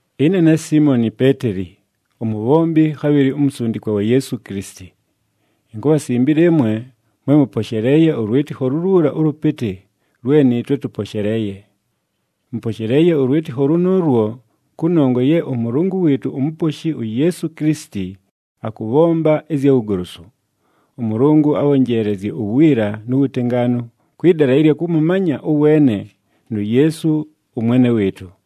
Ɨne ne Siimoni Peeteli, umubhombi khabhɨlɨ umusundikwa wa Yeesu Kilisiti. Inkubhasimbila ɨmwe mwe mʉposheleeye ʉlwɨtɨkho luluula ʉlʉpɨtɨ lwe nɨɨtwe tʉposheleeye. Mʉposheleeye ʉlwɨtɨkho lʉnʉʉlwo kʉnongwa ye ʉMʉlʉngʉ wɨɨtʉ uMuposhi uYeesu Kilisiti, akʉbhomba ɨzya wugolosu. ɄMʉlʉngʉ abhonjeelezye uwiila nu wutengaanu kwɨ dala ɨlya kʉmʉmanya ʉweene nu Yeesu ʉMwene wɨɨtʉ.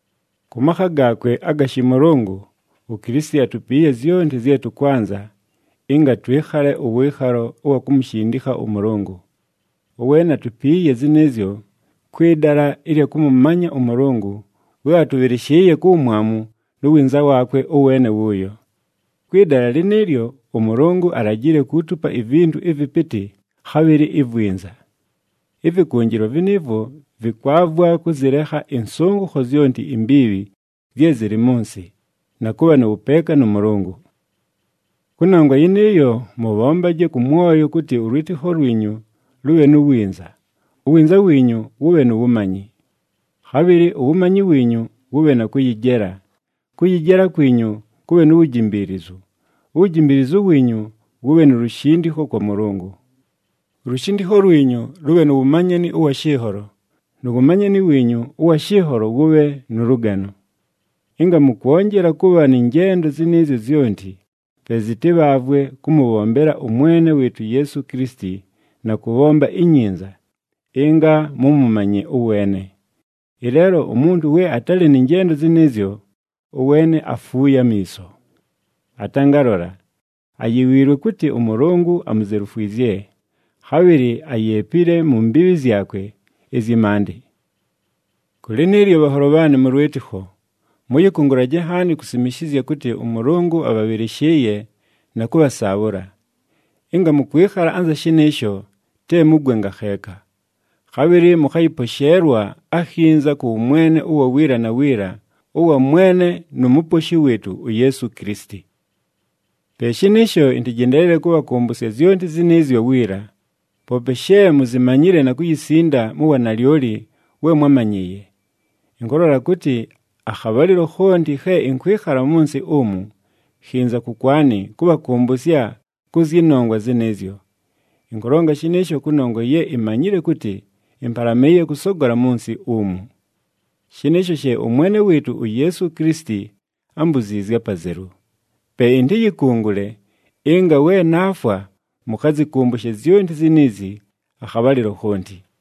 Kʉ makha gaakwe aga shɨmʉlʉngʉ, uKilisiti atupiiye zyonti zye tʉkwanza ɨnga twɨkhale ʉwɨɨkhalo ʉwa kumushindikha ʉMʉlʉngʉ. Ʉweene atupiiye zɨnɨɨzyo kwɨ dala ɨlya kʉmʉmanya ʉMʉlʉngʉ we atʉbhɨlɨshɨɨye ku wumwamu nu winza waakwe ʉweene wʉʉyo. Kwɨ dala lɨnɨɨlyo, ʉMʉlʉngʉ alajile kuutupa ivintu ɨvɨpɨtɨ, khabhɨlɨ ivwinza. Ɨvɨkʉnjɨlwa vɨnɨɨvwo vɨkwavwa kʉzɨlekha ɨnsʉngʉkho zyonti imbiibhi zye zɨlɨ mʉ nsɨ, na kʉbha nʉ wʉpeeka nʉ Mʉlʉngʉ. Kʉnongwa yɨnɨɨyo, mʉbhombaje kʉ mwoyo kʉtɨ ʉlwɨtɨkho lwinyu lʉbhe nu winza, uwinza wiinyu wʉbhe nu wumanyi. Khabhɨlɨ uwumanyi wiinyu wʉbhe na kʉyɨjela, kʉyɨjela kwinyu kʉbhe nu wujimbiilizu, uwujimbiilizu wiinyu wʉbhe nu lushindikho kwa Mʉlʉngʉ. Ulushindikho lwinyu lʉbhe nu wumanyani ʉwa shɨnholo, nu wumanyani wiinyu ʉwa shɨnholo wʉbhe nʉ lʉgano. Ɨnga mʉkwonjela kʉbha nɨ njendo zɨnɨɨzyo zyonti, pe zɨtɨbhaavwe kʉmʉbhombela ʉMwene wɨɨtʉ uYeesu Kilisiti na kʉbhomba inyinza, ɨnga mʉmʉmanye ʉweene. Ɨleelo umuntu we atalɨ nɨ njendo zɨnɨɨzyo, ʉweene afuuye amiiso. Atangalola, ayiwiilwe kʉtɨ ʉMʉlʉngʉ amuzelufwizye, khabhɨlɨ ayeepile mu mbiibhi zyakwe ɨzyɨ maandɨ. Kʉ lɨnɨɨlyo bhanholo bhaanɨ mʉ lwɨtɨkho, mʉyɨkʉngʉlaje nhaani kusimishizya kʉtɨ ʉMʉlʉngʉ abhabhɨlɨshɨɨye na kʉbhasaabhʉla. Ɨnga mʉkwɨkhala anza shɨnɨɨsho, te mugwe ngakheeka. Khabhɨlɨ mʉkhayɨposheelwa akhinza kʉ wʉmwene ʉwa wiila na wiila ʉwa Mwene nu Muposhi wɨɨtʉ uYeesu Kilisiti. Pe shɨnɨɨsho, ɨntɨjendeelele kʉbhakʉmbʉsya zyonti zɨnɨɨzyo wiila, poope she muzimanyile na kuyisinda mu wanalyoli we mwámanyɨɨye. Ɨnkʉlola kʉtɨ, akhabhalɨlo khonti khe ɨnkwɨkhala mʉ nsɨ umu, khinza kʉkwanɨ kʉbhakʉmbʉsya kʉ zyɨ nongwa zɨnɨɨzyo. Ɨnkʉlonga shɨnɨɨsho kʉnongwa ye imanyile kʉtɨ ɨmpalamɨɨye kʉsogola mʉ nsɨ umu. Shɨnɨɨsho she ʉMwene wɨɨtʉ uYeesu Kilisiti ámbuziizye apazelu. Pe ɨntɨyɨkʉngʉle ɨnga we naafwa mʉkhazɨkʉmbʉshe zyonti ziniizi akhabhalɨlo khonti.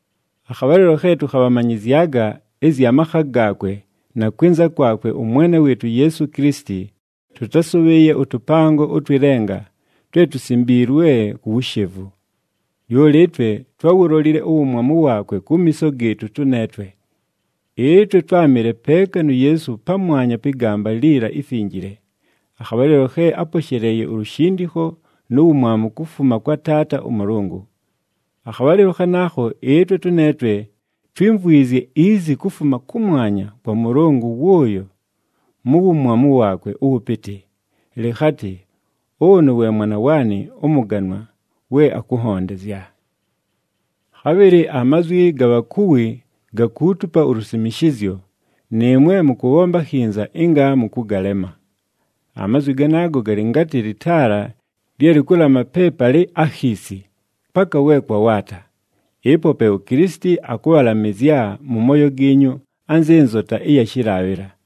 Akhabhalɨlo khe tʉkhabhamanyɨzyaga ɨzya makha gaakwe na kwɨnza kwakwe ʉMwene wɨɨtʉ uYeesu Kilisiti tʉtásʉbhɨɨye ʉtʉpango ʉtwɨ lenga twe tusimbiilwe ku wushevu. Lyoli ɨtwe twáwulolile uwumwamu waakwe kumiiso gɨɨtʉ tʉneetwe. Ɨtwe twámɨle peeka nu Yeesu pamwanya pɨ gamba liila ifinjile, akhabhalɨlo khe áposheleeye ulushindikho nu wumwamu kufuma kwa Taata ʉMʉlʉngʉ. Akhabhalɨlo khanaakho ɨtwe tʉneetwe twímvwizye izi kufuma kʉmwanya kwa Mʉlʉngʉ wʉʉyo mu wumwamu waakwe ʉwʉpɨtɨ, lɨkhatɨ, “Ʉnʉ we Mwana waanɨ ʉmʉganwa we akʉnhondezya.” Khabhɨlɨ amazwi ga bhakuwi gakuutupa ulusimishizyo, nɨɨmwe mʉkʉbhomba akhinza ɨnga mʉkʉgalema. Amazwi ganaago galɨ ngatɨ lɨtaala lye lɨkʉlama pe palɨ akhiisi, paka we kwawaata. Ɨpo pe uKilisiti akʉbhalamɨzya mʉ mooyo giinyu anzɨ nzota ɨya shɨlaabhɨla.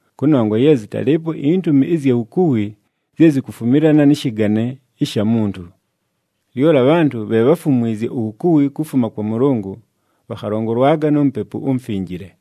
kʉnongwa ye zɨtalɨɨpo intumi ɨzya wukuwi zye zikufumilana nɨ shɨgane ɨsha muntu. Lyoli abhantʉ bhe bháfumwizye uwukuwi kufuma kwa Mʉlʉngʉ, bhakhalongolwaga nu Mupepu uMufinjile.